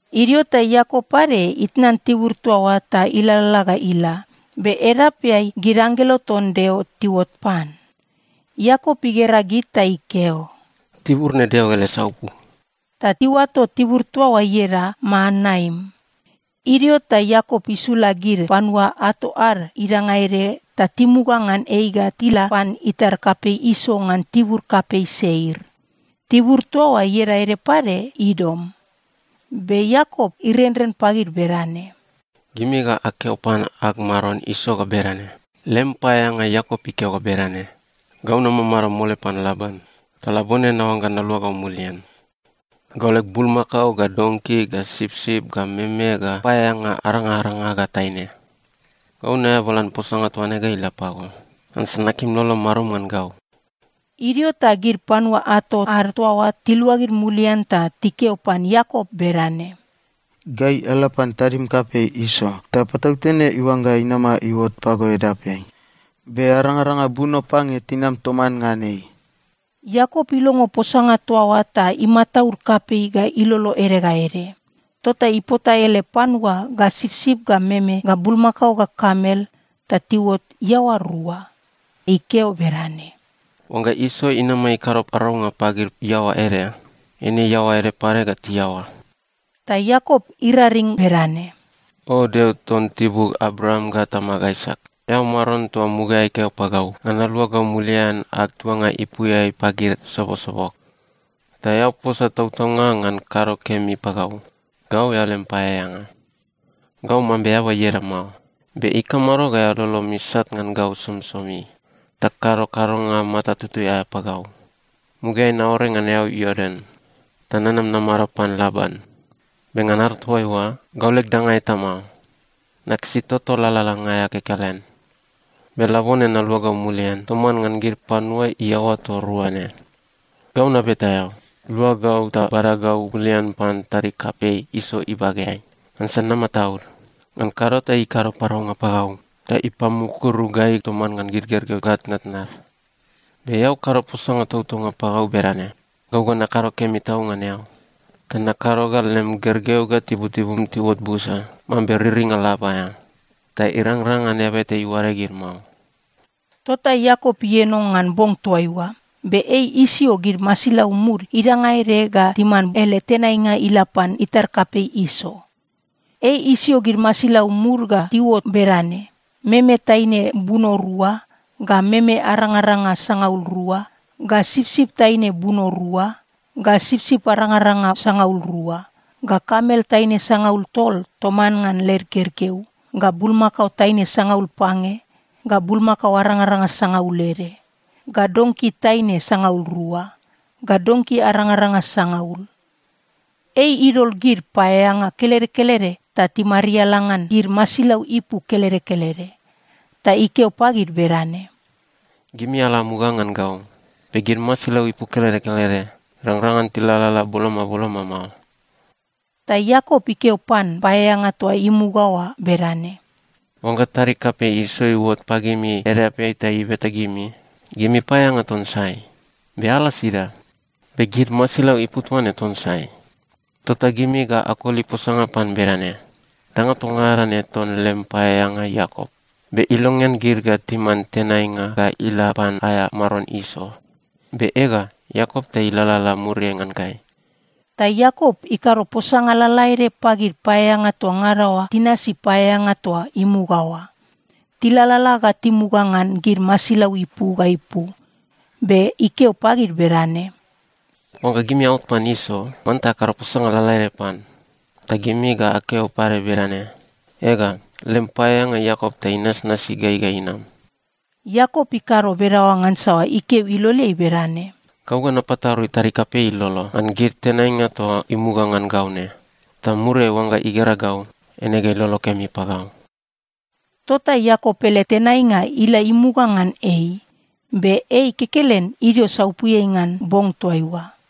Idio ta Iakop pade itnan tibur toa oa ta ilalala ga ila. Be edapeai gid anggelo ton Deo tiuot pan. Iakop igera gid ta ikeo, “Tibur ne Deo ele saupu!” Ta iuato tibur toa oa ieda Maanaim. Idio ta Iakop isula gid panua ato ad idanga ede ta timuga ngan ei ga tila pan itar kapei Iso ngan tibur kapei Seir. (Tibur toa oa ieda ede pade Idom.) Be Iakop irenren pagid bedane, “Gimi ga akeo pan ag maron Iso ga bedane, ‘Lem paeaeanga Iakop ikeo ga bedane: Gau namamado mole pan Laban, ta labone naoangga naluagau mulian. Gau leg bulmakao ga donki ga sipsip ga meme ga paeaeanga arangaranga ga taine. Gau naeabalan posanga toaine ga ila pago, ngansa nakim lolom marum ngan gau.’” Idio ta gid panua ato ad toa oa tiluagid mulian ta tikeo pan Iakop bedane, “Gai ala pan tadim kapei Iso, ta patautene iuangga inama iuot pago edapeai. Be arangaranga buno pange tinam toman ngan ei.” Iakop ilongo posanga toa oa ta imataud kapei ga ilolo ede ga ede. Tota ipota ele panua ga sipsip ga meme ga bulmakao ga kamel ta tiuot iaoa rua. Ikeo bedane, “Oangga Iso inama ikado paraunga pagid iaoa ede, eine iaoa ede pade ga tiaoa.” Ta Iakop iraring bedane, “O Deo ton tibug Abraam ga tamag Aisak, eao Maron toa mugaeai keo pagau ngan naluagau mulian ag tuanga ipuiai pagid sobosobog, ta eao posa tautaunga ngan kado kemi pagau. Gau eao lem paeaeanga. Gau mambe eaba ieda mao, be ikamado ga lolom isat ngan gau somisomi ta kado kadonga mata tutui aea pagau? Mugaeai naore ngan eau Iordan ta nanam namado pan Laban. Be ngan ado toaiua, gau leg danga eta mao. Nakisi toto lalalanga aea kekelen. Be labone naluagau mulian toman ngan gid panua iaoa toa rua ne. Gau nabeta eao, lua gau ta bada gau mulian pan tadig kapei Iso ibageai. Ngansa namataud. Ngan kado ta ikado paraunga pagau ta ipamukuru gai toman ngan gid gergeu ga tnatnad. Be eao kado posanga tautaunga pagau bedane, ‘Gau ga nakado kemi tau ngan eao ta nakado ga lem gergeu ga tibutibum tiuot busa mambe riringa lab aea, ta irangrang ngan eaba eta iuade gid mao.’” Tota Iakop ieno ngan bong toaiua. Be ei isio gid masilau mud idanga ede ga timan ele tenainga ila pan itar kapei Iso. Ei isio gid masilau mud ga tiuot bedane: meme taine buno rua, ga meme arangaranga sangaul rua, ga sipsip taine buno rua, ga sipsip arangaranga sangaul rua, ga kamel taine sangaul tol toman ngan led gergeu, ga bulmakao taine sangaul pange, ga bulmakao arangaranga sangaul ede, ga donki taine sangaul rua, ga donki arangaranga sangaul. Ei idol gid paeaeanga kelede kelede ta timariala ngan gid masilau ipu kelede kelede. Ta ikeo pagid bedane, “Gimi ala amuga ngan gau, be gid masilau ipu kelede kelede irangrang ngan tilalala boloma boloma mao.” Ta Iakop ikeo pan paeaeanga toa imuga oa bedane, “Oangga tadig kapei Iso iuot pagimi edapeai ta ibeta gimi, ‘Gimi paeaeanga ton sai? Be ala sida? Be gid masilau ipu toa ne ton sai?’ tota gimi ga akoli posanga pan bedane, ‘Danga toa ngada ne ton lem paeaeanga Iakop. Be ilongean gid ga timan tenainga ga ila pan aea maron Iso. Be ega, Iakop ta ilalala muriai ngan gai.’” Ta Iakop ikado posanga lalaede pagid paeaeanga toa ngada oa tinasi paeaeanga toa imuga oa. Tilalala ga timuga ngan gid masilau ipu ga ipu, be ikeo pagid bedane, “Oangga gimi aot pan Iso, manta akado posanga lalaede pan. Ta gimi ga akeo pade bedane, ‘Ega, lem paeaeanga Iakop ta inasnasi gai ga inam.’” Iakop ikado bedaoa ngansa ikeo iloleai bedane, “Gau ga napatarui tadig kapei ilolo ngan gid tenainga toa imuga ngan gau ne. Ta muriai oangga igera gau, eine ga ilolo kemi pagau.” Tota Iakop ele tenainga ila imuga ngan ei, be ei kekelen idio saupuiai ngan bong toaiua.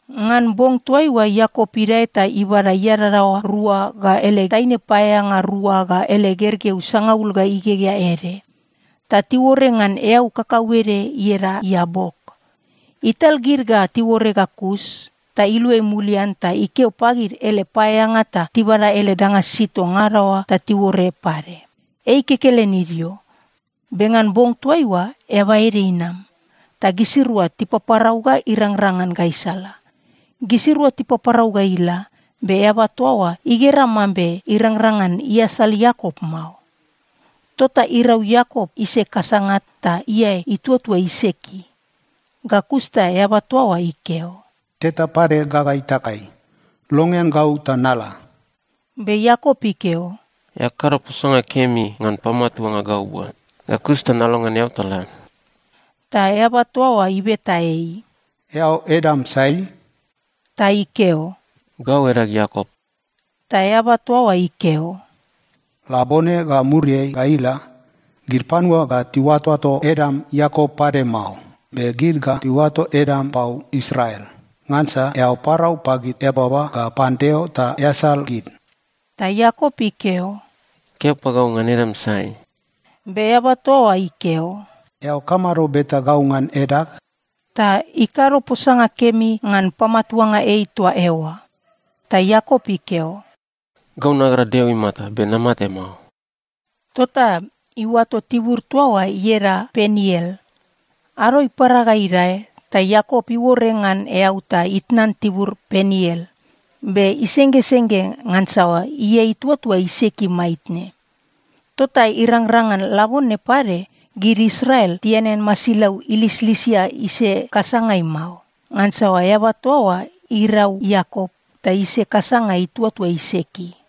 Ngan bong toaiua Iakop idae ta ibada iadadaoa rua ga ele taine paeaeanga rua ga ele gergeu sangaul ga igegea ede, ta tiuore ngan eau kakauede ieda Iabok. Ital gid ga tiuore ga kus, ta iluai mulian ta ikeo pagid ele paeaeanga ta tibada ele danga sisid toa ngada oa ta tiuore pade. Ei kekelen idio, be ngan bong toaiua eaba ede inam, ta gisirua tipaparau ga irangrang ngan gaisala. Gisirua tipaparau ga ila, be eaba toa oa igera mambe irangrang ngan iasal Iakop mao. Tota irau Iakop ise kasanga ta iae ituatua iseki. Ga kus ta eaba toa oa ikeo, “Teta pade gaga itakai. Longean gau ta nala.” Be Iakop ikeo, “Eao kado posanga kemi ngan pamatuanga gau bua. Ga kus ta nalongean eao ta la.” Ta eaba toa oa ibeta ei, “Eao edam sai?” Ta ikeo, “Gau edag Iakop.” Ta eaba toa oa ikeo, “Labone ga muriai ga ila, gid panua ga tiuatoato edam Iakop pade mao, be gid ga tiuato edam pau Israel. Ngansa eao parau pagid eababa ga pan Deo ta easal gid.” Ta Iakop ikeo, “Keo pagau ngan edam sai.” Be eaba toa oa ikeo, “Eao kamado beta gau ngan edag?” Ta ikado posanga kemi ngan pamatuanga ei toa eoa. Ta Iakop ikeo, “Gau nagera Deo imata, be namate mao.” Tota iuato tibur toa oa ieda Peniel. Ado ipara ga idae ta Iakop iuore ngan eau ta itnan tibur Peniel, be isenggesengge ngansa iae ituatua iseki maitne. Tota irangrang ngan labone pade, gid Israel tianean masilau ilislisia ise kasangai mao, ngansa eaba toa oa irau Iakop, ta ise kasanga ituatua iseki.